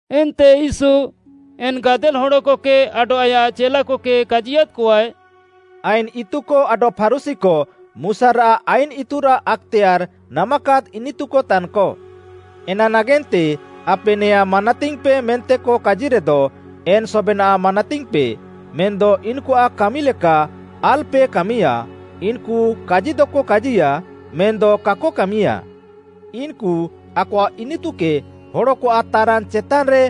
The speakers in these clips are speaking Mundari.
ଏନ୍ତେ ୟୀଶୁ ଏନ୍‌ ଗାଦେଲ୍‌ ହଡ଼କକେ ଆଡଃ ଆୟାଃ ଚେଲାକକେ କାଜିୟାଦ୍‍କଆଏ, “ଆଇନ୍‌ ଇତୁକ ଆଡଃ ଫାରୁଶୀକ ମୁଶାରାଃ ଆଇନ୍‌ ଇତୁରାଃ ଆକ୍‌ତେୟାର୍‌ ନାମାକାଦ୍‌ ଇନିତୁକ ତାନ୍‌କ। ଏନା ନାଗେନ୍ତେ, ଆପେ ନେଆଁଁ ମାନାତିଙ୍ଗ୍‌ପେ ମେନ୍ତେକ କାଜିରେଦ ଏନ୍‌ ସବେନାଃ ମାନାତିଙ୍ଗ୍‌ପେ, ମେନ୍‌ଦ ଇନ୍‌କୁଆଃ କାମିଲେକା ଆଲ୍‌ପେ କାମିୟା, ଇନ୍‌କୁ କାଜିଦକ କାଜିୟା ମେନ୍‌ଦ କାକ କାମିୟାଃ। ଇନ୍‌କୁ ଆକଆଃ ଇନିତୁକେ ହଡ଼କଆଃ ତାରାନ୍‌ ଚେତାନ୍‌ରେ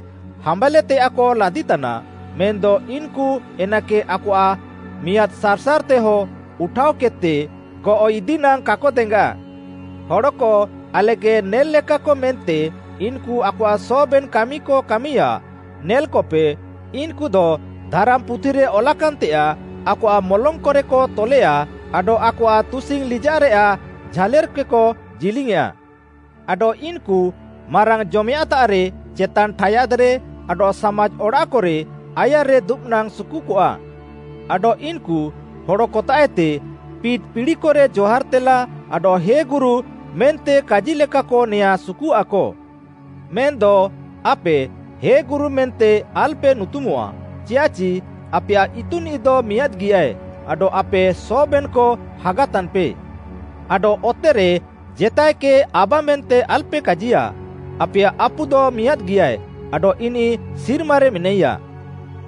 ହାମ୍ବାଲ୍‍ତେୟାଃକ ଲାଦିତାନା, ମେନ୍‌ଦ ଇନ୍‌କୁ ଏନାକେ ଆକଆଃ ମିଆଁଦ୍‌ ସାର୍‌ସାର୍‌ତେହ ଉଠାଅକେଦ୍‌ତେ ଗଅଃଇଦି ନାଙ୍ଗ୍‌ କାକ ଦେଙ୍ଗାଃ। ହଡ଼କ ଆଲେକେ ନେଲ୍‌ଲେକାକ ମେନ୍ତେ ଇନ୍‌କୁ ଆକଆଃ ସବେନ୍‌ କାମିକ କାମିୟାଃ। ନେଲ୍‌କପେ, ଇନ୍‍କୁଦ ଧାରାମ୍‌ପୁଥିରେ ଅଲାକାନ୍‌ତେୟାଃ ଆକଆଃ ମଲଙ୍ଗ୍‌କରେକ ତଲେୟା ଆଡଃ ଆକଆଃ ତୁସିଙ୍ଗ୍‌ ଲିଜାଃରେୟାଃ ଝାଲେର୍‌କେକ ଜିଲିଙ୍ଗ୍‌ଆଃଁ। ଆଡଃ ଇନ୍‌କୁ ମାରାଙ୍ଗ୍‌ଜମେୟାଁଃତାଃରେ ଚେତାନ୍‌ ଠାୟାଦ୍‌ରେ ଆଡଃ ସାମାଜ୍‌ ଅଡ଼ାଃକରେ ଆୟାର୍‌ରେ ଦୁବ୍‌ନାଙ୍ଗ୍‌ ସୁକୁକଆ। ଆଡଃ ଇନ୍‌କୁ ହଡ଼କତାଃଏତେ ପିଟ୍‌ ପିଡ଼ିକରେ ଜହାର୍‌ତେଲା ଆଡଃ ‘ହେ ଗୁରୁ’ ମେନ୍ତେ କାଜିୟାଲେକାକ ନେଆଁଁ ସୁକୁଆଃକ। ମେନ୍‌ଦ ଆପେ ‘ହେ ଗୁରୁ’ ମେନ୍ତେ ଆଲ୍‌ପେ ନୁତୁମଃଆ, ଚିୟାଃଚି ଆପେୟାଃ ଇତୁନିଃଦ ମିଆଁଦ୍‌ଗିଆଏ, ଆଡଃ ଆପେ ସବେନ୍‌କ ହାଗା ତାନ୍‌ପେ। ଆଡଃ ଅତେରେ ଜେତାଏକେ ‘ଆବା’ ମେନ୍ତେ ଆଲ୍‌ପେ କାଜିୟା, ଆପେୟାଃ ଆପୁଦ ମିଆଁଦ୍‌ଗିଆଏ ଆଡଃ ଇନିଃ ସିର୍ମାରେ ମେନାଇୟା।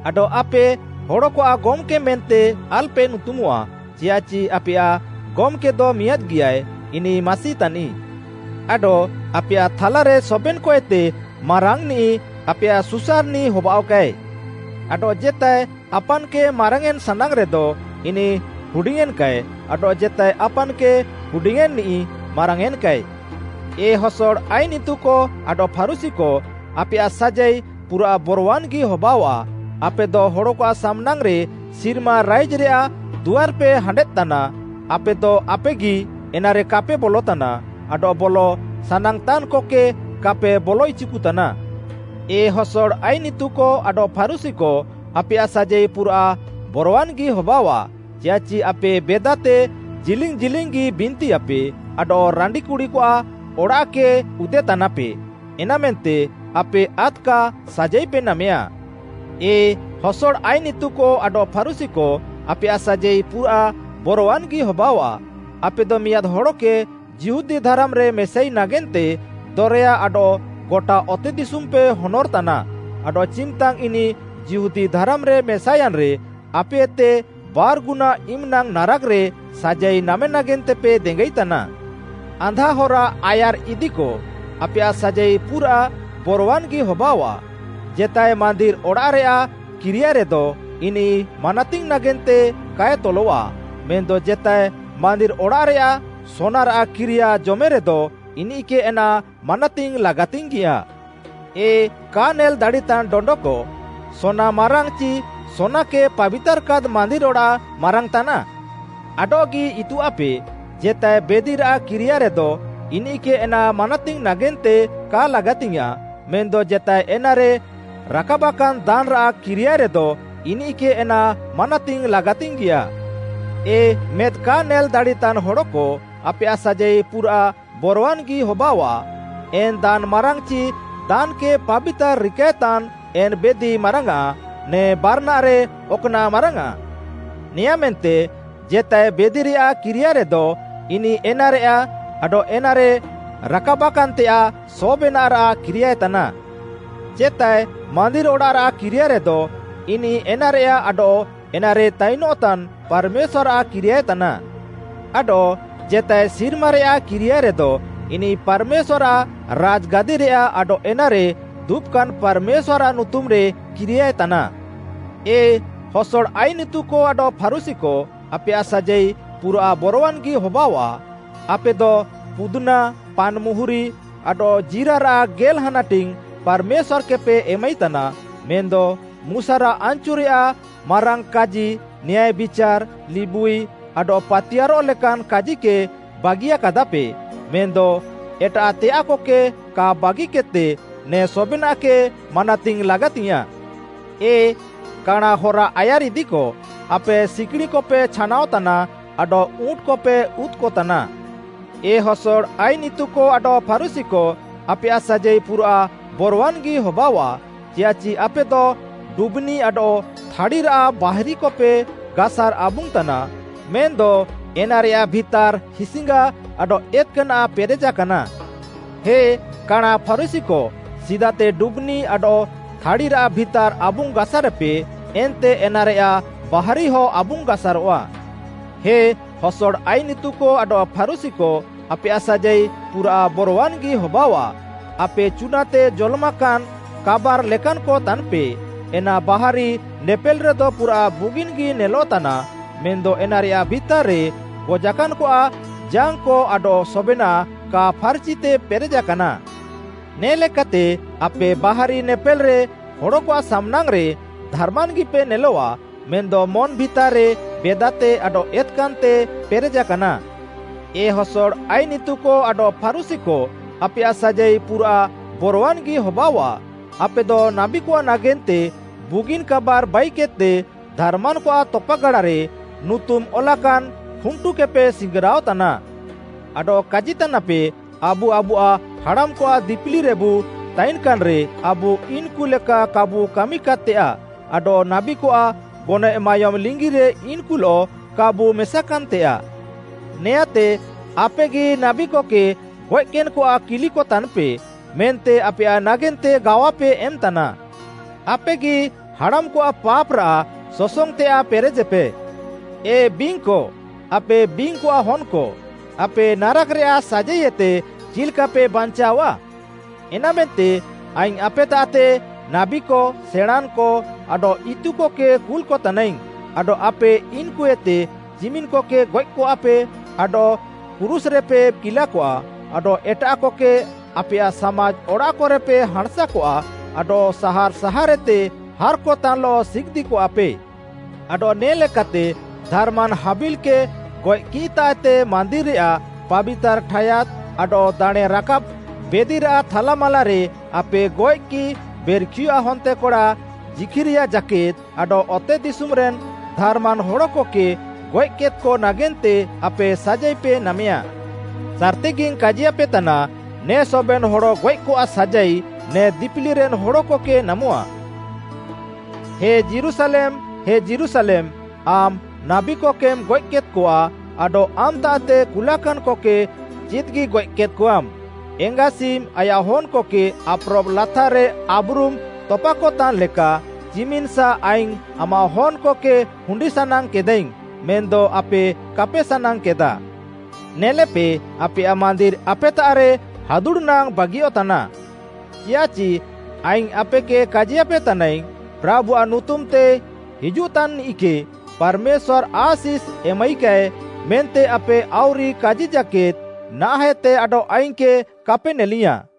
ଆଡଃ ଆପେ ହଡ଼କଆଃ ‘ଗମ୍‌କେ’ ମେନ୍ତେ ଆଲ୍‌ପେ ନୁତୁମଃଆ, ଚିୟାଃଚି ଆପେୟାଃ ଗମ୍‌କେଦ ମିଆଁଦ୍‌ଗିଆଏ, ଇନିଃ ମାସି ତାନିଃ। ଆଡଃ ଆପେୟାଃ ଥାଲାରେ ସବେନ୍‌କଏତେ ମାରାଙ୍ଗ୍‌ନିଃ ଆପେୟାଃ ସୁସାର୍‌ନିଃ ହବାଅଃକାଏ। ଆଡଃ ଜେତାଏ ଆପାନ୍‌କେ ମାରାଙ୍ଗ୍‌ୟେଁନ୍‌ ସାନାଙ୍ଗ୍‌ରେଦ ଇନିଃ ହୁଡିଙ୍ଗ୍‌ୟେଁନ୍‌କାଏ, ଆଡଃ ଜେତାଏ ଆପାନ୍‌କେ ହୁଡିଙ୍ଗ୍‌ୟେଁନ୍‌ନିଃ, ମାରାଙ୍ଗ୍‌ୟେଁନ୍‌କାଏ। “ଏ ହସଡ଼ ଆଇନ୍‌ ଇତୁକ ଆଡଃ ଫାରୁଶୀକ ଆପେୟାଃ ସାଜାଇ ପୁରାଃ ବରୱାନ୍‌ଗି ହବାଅଆଃ, ଆପେଦ ହଡ଼କଆଃ ସାମ୍‌ନାଙ୍ଗ୍‌ରେ ସିର୍ମା ରାଇଜ୍‌ରେୟାଃ ଦୁଆର୍‍ପେ ହାଣ୍ଡେଦ୍‌ ତାନାଃ, ଆପେଦ ଆପେଗି ଏନାରେ କାପେ ବଲତାନା ଆଡଃ ବଲ ସାନାଙ୍ଗ୍‌ତାନ୍‍କକେ କାପେ ବଲ ଇଚିକୁତାନା। ଏ ହସଡ଼ ଆଇନ୍‌ ଇତୁକ ଆଡଃ ଫାରୁଶୀକ ଆପେୟାଃ ସାଜାଇ ପୁରାଃ ବରୱାନ୍‌ଗି ହବାଅଆଃ, ଚିୟାଃଚି ଆପେ ବେଦାତେ ଜିଲିଙ୍ଗ୍‌ ଜିଲିଙ୍ଗ୍‌ଗି ବିନ୍ତିୟାପେ ଆଡଃ ରାଣ୍ଡିକୁଡ଼ିକଆଃ ଅଡ଼ାଃକ ଉଦେତାନାପେ, ଏନାମେନ୍ତେ ଆପେ ଆଦ୍‌କା ସାଜାଇପେ ନାମେୟା। “ଏ ହସଡ଼ ଆଇନ୍‌ ଇତୁକ ଆଡଃ ଫାରୁଶୀକ ଆପେୟାଃ ସାଜାଇ ପୁରାଃ ବରୱାନ୍‌ଗି ହବାଅଆଃ, ଆପେଦ ମିଆଁଦ୍‌ ହଡ଼କେ ଯିହୁଦୀ ଧାରାମ୍‌ରେ ମେସାଇ ନାଗେନ୍ତେ ଦରେୟା ଆଡଃ ଗଟା ଅତେଦିଶୁମ୍‌ପେ ହନର୍‌ତାନା, ଆଡଃ ଚିମ୍‌ତାଙ୍ଗ୍‌ ଇନିଃ ଯିହୁଦୀ ଧାରାମ୍‌ରେ ମେସାୟାନ୍‌ରେ, ଆପେଏତେ ବାର୍‌ଗୁନା ଇମ୍‍ନାଙ୍ଗ୍‌ ନାରାକ୍‌ରେ ସାଜାଇ ନାମେ ନାଗେନ୍ତେପେ ଦେଙ୍ଗାଇତାନା। “ଆନ୍ଧା ହରା ଆୟାର୍‌ଇଦିକ ଆପେୟାଃ ସାଜାଇ ପୁରାଃ ବରୱାନ୍‌ଗି ହବାଅଆଃ, ‘ଜେତାଏ ମାନ୍ଦିର୍‌ ଅଡ଼ାଃରେୟାଃ କିରିୟାଏରେଦ ଇନିଃ ମାନାତିଙ୍ଗ୍‌ ନାଗେନ୍ତେ କାଏ ତଲଃଆ ମେନ୍‌ଦ ଜେତାଏ ମାନ୍ଦିର୍‌ ଅଡ଼ାଃରେୟାଃ ସୋନାରାଃ କିରିୟା ଜମେରେଦ ଇନିଃକେ ଏନା ମାନାତିଙ୍ଗ୍‌ ଲାଗାତିଙ୍ଗ୍‌ୟାଁଃ।’ ଏ କା ନେଲ୍‌ ଦାଡ଼ିତାନ୍‌ ଡଣ୍ଡକ, ସୋନା ମାରାଙ୍ଗ୍‌ ଚି ସୋନାକେ ପାବିତାର୍‌କାଦ୍‌ ମାନ୍ଦିର୍‌ ଅଡ଼ାଃ ମାରାଙ୍ଗ୍‌ ତାନାଃ? ଆଡଃଗି ଇତୁଆଃପେ, ‘ଜେତାଏ ବେଦିରାଃ କିରିୟାଏରେଦ ଇନିଃକେ ଏନା ମାନାତିଙ୍ଗ୍‌ ନାଗେନ୍ତେ କା ଲାଗାତିଙ୍ଗ୍‌ୟାଁଃ, ମେନ୍‌ଦ ଜେତାଏ ଏନାରେ ରାକାବାକାନ୍‍ ଦାନ୍‌ରାଃ କିରିୟାଏରେଦ ଇନିଃକେ ଏନା ମାନାତିଙ୍ଗ୍‌ ଲାଗାତିଙ୍ଗ୍‌ୟାଁଃ।’ ଏ ମେଦ୍‌ କା ନେଲ୍‌ ଦାଡ଼ିତାନ୍‌ ହଡ଼କ ଆପେୟାଃ ସାଜାଇ ପୁରାଃ ବରୱାନ୍‌ଗି ହବାଅଆଃ, ଏନ୍‌ ଦାନ୍‌ ମାରାଙ୍ଗ୍‌ଆଁଚି ଦାନ୍‌କେ ପାବିତାର୍‌ ରିକାଏତାନ୍‌ ଏନ୍‍ ବେଦି ମାରାଙ୍ଗ୍‌ଆଁ, ନେ ବାରାନାଃରେ ଅକ୍‌ନାଃ ମାରାଙ୍ଗ୍‌ଆଁ? ନେଆଁଁମେନ୍ତେ ଜେତାଏ ବେଦିରେୟାଃ କିରିୟାଏରେଦ, ଇନିଃ ଏନାରେୟାଃ ଆଡଃ ଏନାରେ ରାକାବାକାନ୍‌ତେୟାଃ ସବେନାଃରାଃ କିରିୟାଏତାନା। ଜେତାଏ ମାନ୍ଦିର୍‌ ଅଡ଼ାଃରାଃ କିରିୟାଏରେଦ ଇନିଃ ଏନାରେୟାଃ ଆଡଃ ଏନାରେ ତାଇନଃତାନ୍‌ ପାର୍‌ମେଶ୍ୱାର୍‌ଆଃ କିରିୟାଏତାନା। ଆଡଃ ଜେତାଏ ସିର୍ମାରେୟାଃ କିରିୟାଏରେଦ ଇନିଃ ପାର୍‌ମେଶ୍ୱାର୍‌ଆଃ ରାଜ୍‌ଗାଦିରେୟାଃ ଆଡଃ ଏନାରେ ଦୁବାକାନ୍‌ ପାର୍‌ମେଶ୍ୱାର୍‌ଆଃ ନୁତୁମ୍‌ରେ କିରିୟାଏତାନା। “ଏ ହସଡ଼ ଆଇନ୍‌ ଇତୁକ ଆଡଃ ଫାରୁଶୀକ ଆପେୟାଃ ସାଜାଇ ପୁରାଃ ବରୱାନ୍‌ଗି ହବାଅଆଃ, ଆପେଦ ପୁଦ୍‌ନା, ପାନ୍‌ମୁହୁରି ଆଡଃ ଜୀରାରାଃ ଗେଲ୍‌ ହାନାଟିଙ୍ଗ୍‌ ପାର୍‌ମେଶ୍ୱାର୍‌କେପେ ଏମାଇତାନା, ମେନ୍‌ଦ ମୁଶାରାଃ ଆନ୍‌ଚୁରେୟାଃ ମାରାଙ୍ଗ୍‌କାଜି, ନ୍ୟାୟ ବିଚାର୍‌, ଲିବୁଇ ଆଡଃ ପାତିୟାର୍‌ରଃ ଲେକାନ୍‌ କାଜିକେ ବାଗିୟାକାଦାପେ, ମେନ୍‌ଦ ଏଟାଃତେୟାଃକକେ କା ବାଗିକେଦ୍‌ତେ ନେ ସବେନାଃକେ ମାନାତିଙ୍ଗ୍‌ ଲାଗାତିଙ୍ଗ୍‌ୟାଁଃ। ଏ କାଣାଁ ହରା ଆୟାର୍‌ଇଦିକ, ଆପେଦ ସିକିଣିଁକପେ ଛାନାଅତାନା ଆଡଃ ଉଁଟ୍‌କପେ ଉଦ୍‌କତାନା। “ଏ ହସଡ଼ ଆଇନ୍‌ ଇତୁକ ଆଡଃ ଫାରୁଶୀକ ଆପେୟାଃ ସାଜାଇ ପୁରାଃ ବରୱାନ୍‌ଗି ହବାଅଆଃ, ଚିୟାଃଚି ଆପେଦ ଡୁବ୍‌ନି ଆଡଃ ଥାଡ଼ିରାଃ ବାହାରିକପେ ଗାସାର୍‍ ଆବୁଙ୍ଗ୍‌ ତାନା। ମେନ୍‌ଦ ଏନାରେୟାଃ ଭିତାର୍‌ ହିସ୍‌ଙ୍ଗା ଆଡଃ ଏତ୍‍କାନାଃ ପେରେଜାକାନା। ହେ କାଣାଁ ଫାରୁଶୀକ ସିଦାତେ ଡୁବ୍‌ନି ଆଡଃ ଥାଡ଼ିରାଃ ଭିତାର୍‌ ଆବୁଙ୍ଗ୍‌ଗାସାରେପେ ଏନ୍ତେ ଏନାରେୟାଃ ବାହାରିହଁ ଆବୁଙ୍ଗ୍‌ଗାସାରଃଆ। “ହେ ହସଡ଼ ଆଇନ୍‌ ଇତୁକ ଆଡଃ ଫାରୁଶୀକ, ଆପେୟାଃ ସାଜାଇ ପୁରାଃ ବରୱାନ୍‌ଗି ହବାଅଆଃ, ଆପେ ଚୁନାତେ ଜଲମାକାନ୍‍ କାବାର୍‌ ଲେକାନ୍‌କ ତାନ୍‌ପେ, ଏନା ବାହାରି ନେପେଲ୍‍ରେଦ ପୁରାଃ ବୁଗିନ୍‍ଗି ନେଲଃତାନା ମେନ୍‌ଦ ଏନାରେୟାଃ ଭିତାର୍‌ରେ ଗଜାକାନ୍‍କଆଃ ଜାଙ୍ଗ୍‌କ ଆଡଃ ସବେନାଃ କା ଫାର୍‌ଚିତେ ପେରେଜାକାନା। ନେ ଲେକାତେ ଆପେ ବାହାରି ନେପେଲ୍‌ରେ ହଡ଼କଆଃ ସାମ୍‌ନାଙ୍ଗ୍‌ରେ ଧାର୍‌ମାନ୍‌ଗିପେ ନେଲଆଃ ମେନ୍‌ଦ ମନ୍‌ ଭିତାର୍‌ରେ ବେଦାତେ ଆଡଃ ଏତ୍‌କାନ୍‌ତେ ପେରେଜାକାନା। “ଏ ହସଡ଼ ଆଇନ୍‌ ଇତୁକ ଆଡଃ ଫାରୁଶୀକ ଆପେୟାଃ ସାଜାଇ ପୁରାଃ ବରୱାନ୍‌ଗି ହବାଅଆଃ, ଆପେଦ ନାବୀକଆଃ ନାଗେନ୍ତେ ବୁଗିନ୍‌ କାବାର୍‌ ବାଇକେଦ୍‌ତେ ଧାର୍‌ମାନ୍‌କଆଃ ତପାଗାଡ଼ାରେ ନୁତୁମ୍‌ ଅଲାକାନ୍‌ ଖୁଣ୍ଟୁକେପେ ସିଙ୍ଗ୍‌ରାଅ ତାନା। ଆଡଃ କାଜିତାନାପେ, ‘ଆବୁ ଆବୁଆଃ ହାଡ଼ାମ୍‌କଆଃ ଦିପିଲିରେବୁ ତାଇନ୍‌କାନ୍‌ରେ, ଆବୁ ଇନ୍‌କୁ ଲେକା କାବୁ କାମିକାଦ୍‌ତେୟାଃ ଆଡଃ ନାବୀକଆଃ ଗନଏଃ ମାୟୋମ୍‌ ଲିଙ୍ଗିରେ ଇନ୍‌କୁଲଃ କାବୁ ମେସାକାନ୍‌ତେୟାଃ।’ ନେଆଁଁତେ ଆପେଗି ନାବୀକକେ ଗଏଃକେନ୍‌କଆଃ କିଲିକ ତାନ୍‌ପେ ମେନ୍ତେ ଆପେୟାଃ ନାଗେନ୍ତେ ଗାୱାପେ ଏମ୍‌ତାନା। ଆପେଗି ହାଡ଼ାମ୍‌କଆଃ ପାପ୍‌ରାଃ ସସଙ୍ଗ୍‌ତେୟାଃ ପେରେଜେପେ। ଏ ବିଙ୍ଗ୍‌କ, ଆପେ ବିଙ୍ଗ୍‌କଆଃ ହନ୍‌କ! ଆପେ ନାରାକ୍‌ରେୟାଃ ସାଜାଇଏତେ ଚିଲ୍‍କାପେ ବାଞ୍ଚାଅଃଆ? ଏନାମେନ୍ତେ ଆଇଙ୍ଗ୍‌ ଆପେତାଃତେ ନାବୀକ, ସେଣାଁଁନ୍‌କ, ଆଡଃ ଇତୁକକେ କୁଲ୍‌କତାନାଇଙ୍ଗ୍‌, ଆଡଃ ଆପେ ଇନ୍‌କୁଏତେ ଚିମିନ୍‍କକେ ଗଏଃକଆପେ ଆଡଃ କ୍ରୁଶ୍‍ରେପେ କିଲାକଆ ଆଡଃ ଏଟାଃକକେ ଆପେୟାଃ ସାମାଜ୍‌ ଅଡ଼ାଃକରେପେ ହାଁଣ୍‌ସାକଆ ଆଡଃ ସାହାର୍‌ ସାହାର୍‌ଏତେ ହାର୍‍କତାନ୍‌ଲଃ ସିଗିଦ୍‌‍କଆପେ। ଆଡଃ ନେ ଲେକାତେ ଧାର୍‌ମାନ୍‌ ହାବିଲ୍‌କେ ଗଏଃକିଃତାଃଏତେ ମାନ୍ଦିର୍‌ରେୟାଃ ପାବିତାର୍‌ ଠାୟାଦ୍‌ ଆଡଃ ଦାଣେଁରାକାବ୍‌ ବେଦିରାଃ ଥାଲାମାଲାରେ ଆପେ ଗଏଃକିଃ ବେର୍‌ଖିୟଆଃ ହନ୍ତେକଡ଼ା ଜିଖ୍‌ରିୟା ଜାକେଦ୍‌ ଆଡଃ ଅତେଦିଶୁମ୍‌ରେନ୍‌ ଧାର୍‌ମାନ୍‌ ହଡ଼କକେ ଗଏଃକେଦ୍‌କ ନାଗେନ୍ତେ ଆପେ ସାଜାଇପେ ନାମେୟା। ସାର୍‌ତିଗିଙ୍ଗ୍‌ କାଜିୟାପେତାନା, ନେ ସବେନ୍‌ ହଡ଼ଗଏଃକଆଃ ସାଜାଇ ନେ ଦିପିଲିରେନ୍‌ ହଡ଼କକେ ନାମଃଆ। “ହେ ଯୀରୁଶାଲେମ୍‌, ହେ ଯୀରୁଶାଲେମ୍‌, ଆମ୍‌ ନାବୀକକେମ୍‌ ଗଏଃକେଦ୍‌କଆ ଆଡଃ ଆମ୍‌ତାଃତେ କୁଲାକାନ୍‌କକେ ଚିଦ୍‌ଗିଗଏଃ କେଦ୍‌କଆମ୍‌, ଏଙ୍ଗାସିମ୍‌ ଆୟାଃ ହନ୍‌କକେ ଆପ୍‌ରବ୍‌ ଲାତାର୍‌ରେ ଆବ୍‌ରୁମ୍‌ ତପାକତାନ୍‌ଲେକା ଚିମିନ୍‌ସା ଆଇଙ୍ଗ୍‌ ଆମାଃ ହନ୍‌କକେ ହୁଣ୍ଡିସାନାଙ୍ଗ୍‌କେଦାଇଙ୍ଗ୍‌, ମେନ୍‌ଦ ଆପେ କାପେ ସାନାଙ୍ଗ୍‌କେଦାଃ। ନେଲେପେ, ଆପେୟାଃ ମାନ୍ଦିର୍‌ ଆପେତାଃରେ ହାଦୁଡ଼୍‌ନାଙ୍ଗ୍‌ ବାଗିୟଃତାନା। ଚିୟାଃଚି ଆଇଙ୍ଗ୍‌ ଆପେକେ କାଜିୟାପେ ତାନାଇଙ୍ଗ୍‌, ‘ପ୍ରାଭୁଆଃ ନୁତୁମ୍‌ତେ ହିଜୁଃତାନ୍‌ନିଃକେ ପାର୍‌ମେଶ୍ୱାର୍‌ ଆଶିଷ୍‌ ଏମାଇକାଏ’ ମେନ୍ତେ ଆପେ ଆଉରି କାଜି ଜାକେଦ୍‌ ନାହାଁଃଏତେ ଆଡଃ ଆଇଙ୍ଗ୍‌କେ କାପେ ନେଲିୟାଁଃ।”